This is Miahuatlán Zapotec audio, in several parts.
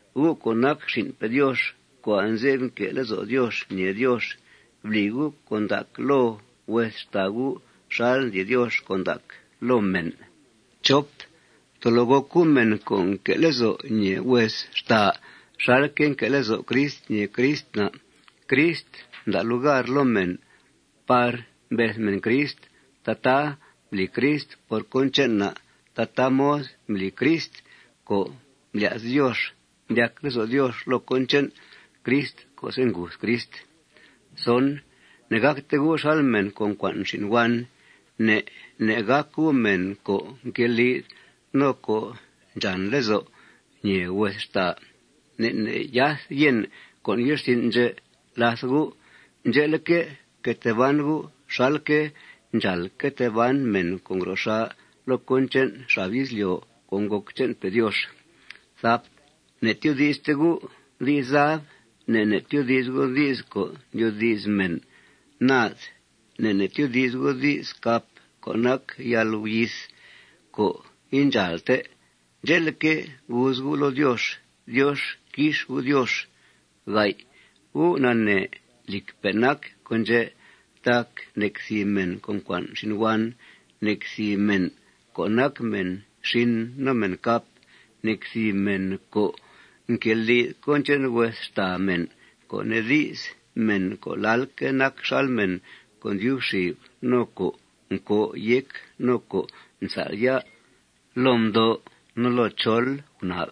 Gu' co' nac xin'pe' Diox co' anze'f nque' lezo' Diox ñèe Diox, bli gu' con' ndac loo hues xtàa gu' xal ndli Diox con' ndac loo mèn. Tolo gòc gu' mèn co' nque'que' lezo' ñèe hues xtàa xalque' nque' lezo' Crist ñèe Crist na'. Crist mda' lugar loo mèn par mbeth mèn Crist. Tataa mbli Crist por cón che'n na'. Tataa mod mbli Crist co' mblya's Diox. Mdyac lezo' Diox loo cón che'n Crist co'se' nguth Crist. Ne'gàcte gu' xal mèn co' ncua'n xin' huan. Ne' ne' gàc gu' mèn co' nqueli'th no co' ndxàn lezo' ñèe hues xtàa. Ne' ne' yath yèn con' ye'rsin' ndxè' làth gu'. Ndxe'leque', fque tee ban gu' xalque' ndxàal que tee ban mèn co' ngro xà' loo cón che'n xab izlyo' co' ngòc che'npe' Diox. Ne'tyoodi'ste gu' di's zab. Ne' ne' tyoodi's gu' di's co' ndyoodi's mèn naad. Ne' ne' tyoodi's gu' di's cap co' nac yalguyith co' indxàalte. Ndxe'leque', guuz gu' loo Diox: Diox quix U', Diox. Gu' nanee lìcpe' nac con' ndxè' tac nec thìb mèn co' ncua'n xin' huan, nec thìb mèn co' nac mèn xin no mèn cap, nec thìb mèn co' nqueli'th cón che'n hues xtàa mèn, co' nee di's, mèn co' lalque' nac xal mèn co' ndyub xib no co' ncòo' yéc no co' nsál' ya' loo mdo' no loo chol gunab,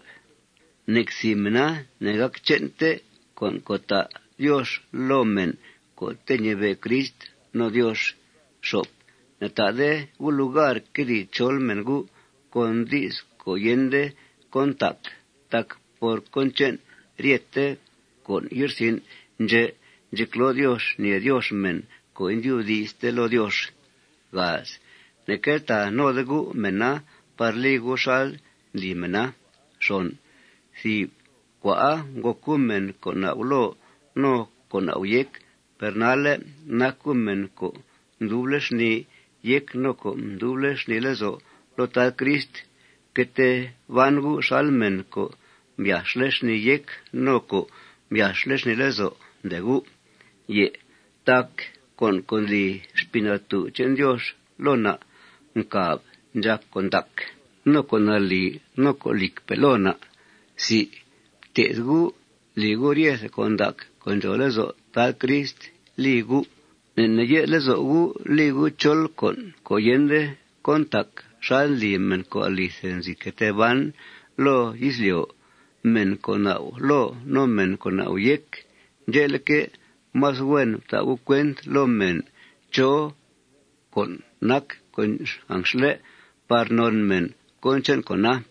nec thìb mèna ne'gàc che'nte con' co' ta' Diox loo mèn co'te' ñibe' Crist no Diox. Ne'ta'de gu' lugar quedìi chol mèn gu' con di's co' yende cón ntac tac por cón che'n ryete con' ye'rsin' ndxè' ndxecloo Diox ñèe Diox mèn co' indyubdi'ste loo Diox. Ne'queltàa node gu' mèna par li gu' xal ndli mèna. Thìb cua'a ngòc gu' mèn co' nau' loo no co' nau' yéc. Per nalle' nac gu' mèn co' nduble' xnìi yéc no co' nduble' xnìi lezo' loo Tad Crist. Fque tee ban gu' xal mèn co' mbyà'xle' xnìi yéc no co' mbyà'xle' xnìi lezo', ndee gu'. Tac con' co' ndli Xpii Natú' che'n Diox loo na' ncàb ndxàc con' ndac, no con' nalì, no con' lìcpe' loo na'. Fté'th gu' li gu' ryete con' ndac co' ndxòo lezo' Tad Crist li gu'. Ne' ne' ye'th lezo' gu' li gu' chol con' co' yende cón ntac xal ndli mèn co' alithe nzi que tee ban loo izlyo', mèn co' nau' loo no mèn co' nau' yéc. Ndxe'leque', más huen fta' gu' cuent loo mèn chó con' nac con' anxle' par non mèn cón che'n con'a.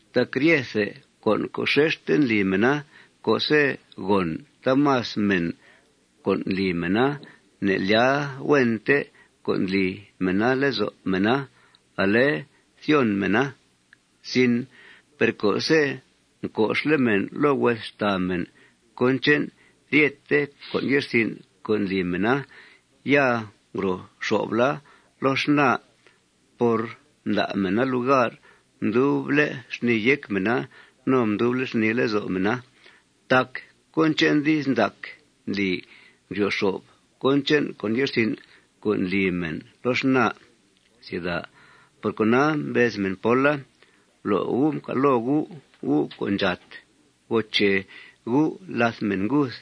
Tac ryethe con' co' xexte ndli mèna, co'se' gòn taamas mèn con' ndli mèna, ne'lyàa huente con' ndli mèna lezo' mèna. Ale thyon mèna. Per co'se' mco'xle' mèn loo hues xtàa mèn cón che'n ryete con' ye'rsin' co' ndli mèna, ya ngro xo'fla loo xnaa por mda' mèna lugar mduble' xnìi yéc mèna no mduble' xnìi lezo' mèna. Tac cón che'n di's ndac ndli ndryo xo'f cón che'n con' ye'rsin' co' ndli mèn loo xnaa. Por cona, mbez mèn póla: Blo' gu' mcal' loo gu', gu' co' ndxàt. Goo che gu' làth mèn nguth.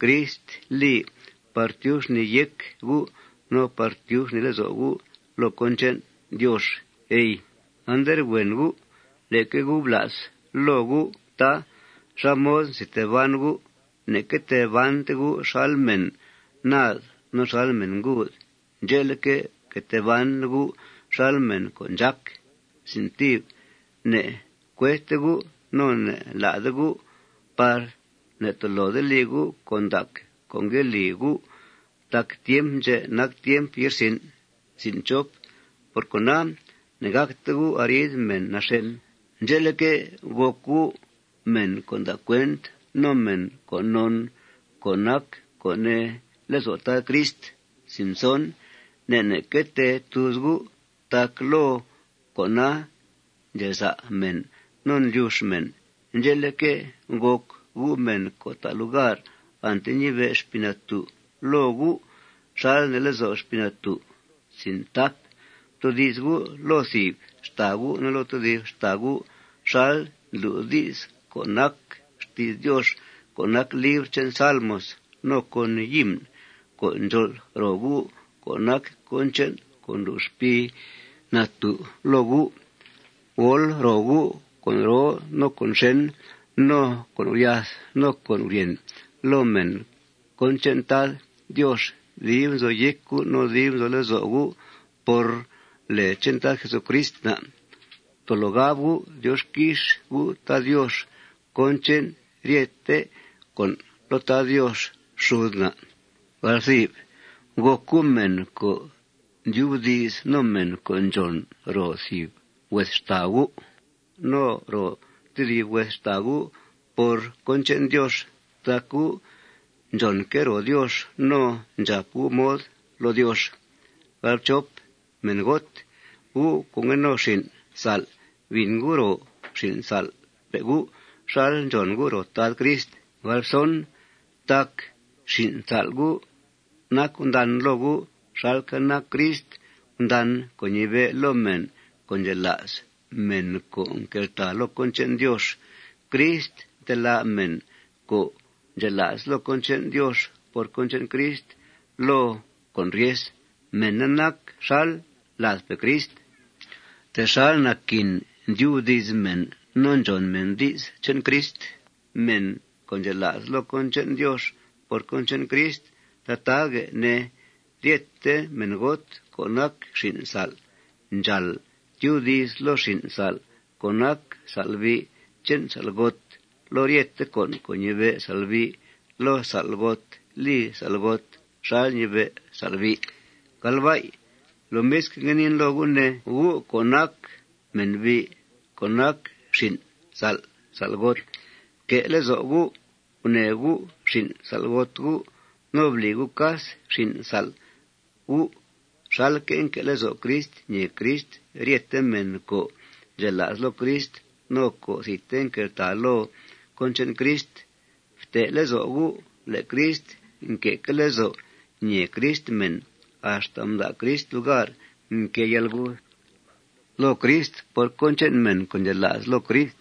Crist li par tyub xnìi yéc gu' no par tyub xnìi lezo' gu' loo cón che'n Diox, ey. Anderhuen gu'. Leque gu' bla's loo gu', tá, xá mod nzi tee ban gu'. Ne'que tee bante gu' xal mèn naad no xal mèn nguud. Ndxe'leque', fque tee ban gu' xal mèn co' ndxác. Ne'cuedte gu' no ne'lá'de gu' par ne'tolode li gu' con' ndac co' ngue li gu' tac tiemp ndxè' nac tiemp ye'rsin'. Por cona, ne'gàcte gu' arid mèn naxèn. Ndxe'leque', gòc gu' mèn co' nda' cuent no mèn co' non co' nac co' nee lezo' Tad Crist. Ne' ne' que tee tuuz gu' tac loo con'a ndxeza' mèn no ndlyux mèn. Ndxe'leque', gòc gu' mèn co' ta' lugar ante ñibe' Xpii Natú' loo gu' xal nee lezo' Xpii Natú'. Ftoodi's gu' loo thìb xtàa gu' no loo tedib xtàa gu' xal ndlu' di's co' nac xti's Diox co' nac libr che'n salmos no con himn co' ndxol' ro gu' co' nac cón che'n co' ndlu' Xpii Natú' loo gu'. Gol' ro gu' con' roo no con' xèn no con' guryath no con' guryèn loo mèn cón che'n Tad Diox dib nzo yéc gu' no dib nzo lezo' gu'. Por lèe che'n Tad Jesucrist na', tolo gab gu' Diox quix U', Tad Diox, cón che'n ryete con' loo Tad Diox xud na'. Gòc gu' mèn co' ndyubdi's no mèn co' ndxòn ro thìb hues xtàa gu' no ro tedib hues xtàa gu' por cón che'n Diox tac gu' ndxònque' ro Diox no ndxàp gu' mod loo Diox. Mèngot, gu' co' ngue no xin' sa'l, bìn gu' ro xin' sa'lpe' gu' xal ndxòn gu' ro Tad Crist. Tac xin' sa'l gu' nac gundan loo gu' xalque' nac Crist gundan co' ñibe' loo mèn co' ndxela's, mèn co' nqueltàa loo cón che'n Diox. Crist ntelá' mèn co' ndxela's loo cón che'n Diox por cón che'n Crist loo con' ryes. Mèna nac xal ladpe' Crist. Texal naquin ndyubdi's mèn no ndxòn mèn di's che'n Crist, mèn co' ndxela's loo cón che'n Diox por cón che'n Crist, tataaguè' ne, ryete mèngot co' nac xin' sa'l ndxàal tyubdi's loo xin' sa'l co' nac sa'lbi' che'n sa'lgota loo ryete con' co' ñibe' sa'lbi' loo sa'lgot. Li sa'lgota xal ñibe' sa'lbi'i. Lomisque', ngue niin loo gu', ne, gu' co' nac mènbi' co' nac xin' sa'l sa'lgot: Fque' lezo' gu' gunèe gu' xin' sa'lgot gu'. No bli gu' cas xin' sa'l gu' xalque' nque' lezo' Crist ñèe Crist ryete mèn co' ndxela's loo Crist no co' thidte nqueltàa loo cón che'n Crist. Fte' lezo' gu' le' Crist nque'que' lezo' ñèe Crist mèn axta mda' Crist lugar mquée yalguth loo Crist por cón che'n mèn co' ndxela's loo Crist.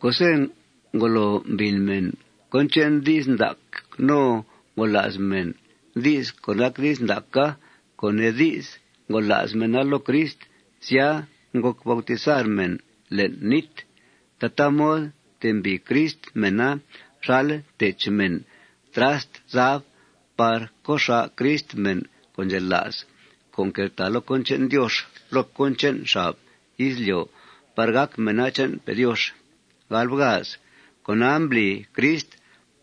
Co'se' ngolo mbìn mèn cón che'n di's ndac no ngola's mèn di's co' nac di's ndaca, co' nee di's, ngola's mèna loo Crist, sya, ngòc bautizar mèn le'n nít. Tataa mod mtembìi Crist mèna xal ntech mèn trast zab par co' xà' Crist mèn co' ndxela's co' nqueltàa loo cón che'n Diox loo cón che'n xab izlyo' par gàc mèna che'npe' Diox. Con'a mbli Crist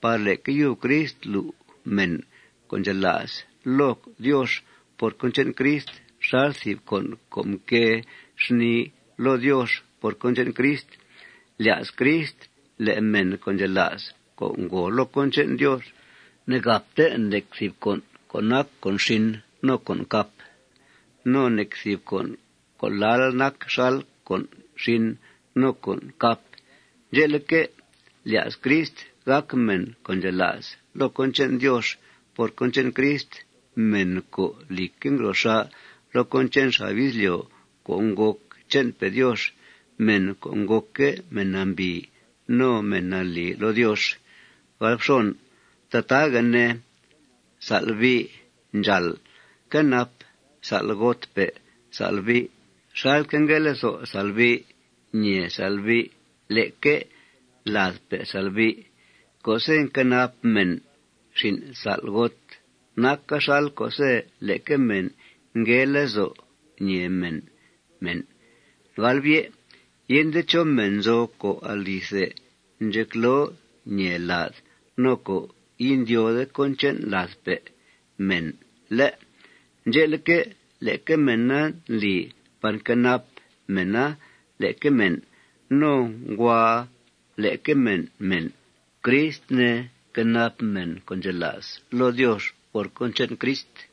par leque yub Crist lu' mèn co' ndxela's loo Diox por cón che'n Crist xal thìb con' co' nquée xnìi loo Diox por cón che'n Crist. Lya's Crist le' mèn co' ndxela's, co' ngòo loo cón che'n Diox, ne'gàpte nec thìb con' co' nac con' xin no con' cap no nec thìb con' co' lal nac xal con' xin no con' cap. Ndxe'leque', lya's Crist gàc mèn co' ndxela's loo cón che'n Diox por cón che'n Crist, mèn co', lìcque', ngro xà' loo cón che'n xab izlyo' co' ngòc che'npe' Diox, mèn co' ngòcque' mèn nambìi no mèn nalì loo Diox. Tataaguè' ne, sa'lbi' ndxàal quenap sa'lgotpe' sa'lbi' xalque' ngue lezo' sa'lbi' ñèe sa'lbi' leque ladpe' sa'lbi'. Co'se' nquenap mèn xin' sa'lgot, naca xal co'se' leque mèn ngue lezo' ñèe mèn mèn. Yende chó mèn nzo co' alithe ndxecloo ñèe lad no co' indyóode cón che'n ladpe' mèn, ¿lé'? Ndxe'leque', leque mèna ndli par nquenap mèna leque mèn. No nguàa leque mèn mèn. Crist, ne, nquenap mèn co' ndxela's loo Diox por cón che'n Crist.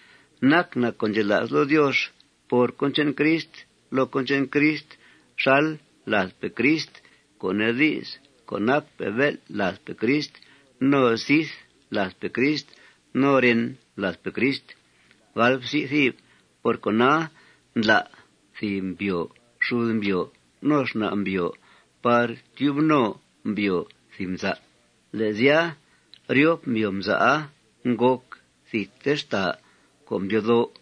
Nac na' co' ndxela's loo Diox por cón che'n Crist loo cón che'n Crist xal ladpe' Crist, co' nee di's, co' nacpe' bél' ladpe' Crist no sith ladpe' Crist no ren ladpe' Crist. Por cona, ndlá' thìb mbyòo xud mbyòo no xna' mbyòo par tyub no mbyòo thìb mza'. Le' sya, ryop mbyòo mza'a ngòc thidte xtàa co' mdyoo dó'.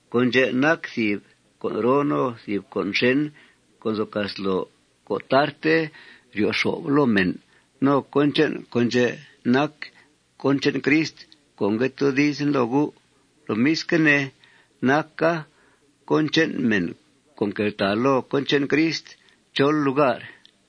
Con' ndxè' nac thìb con' roo no thìb con' xèn co' nzo casloo co' tarte ryo xo'f loo mèn. No cón che'n con' ndxè' nac cón che'n Crist co' ngue toodizen loo gu'. Lomisque' ne, naca cón che'n mèn co' nqueltàa loo cón che'n Crist chol lugar.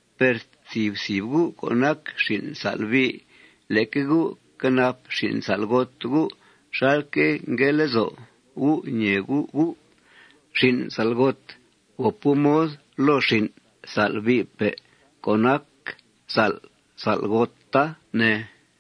Per thìb thìb gu' co' nac xin' sa'lbi', leque gu' quenap xin' sa'lgot gu' xalque' ngue lezo' gu' ñèe gu' gu'. Xin' sa'lgot, gòp gu' mod loo xin' sa'lbi'pe' co' nac sa'l sa'lgota, ne.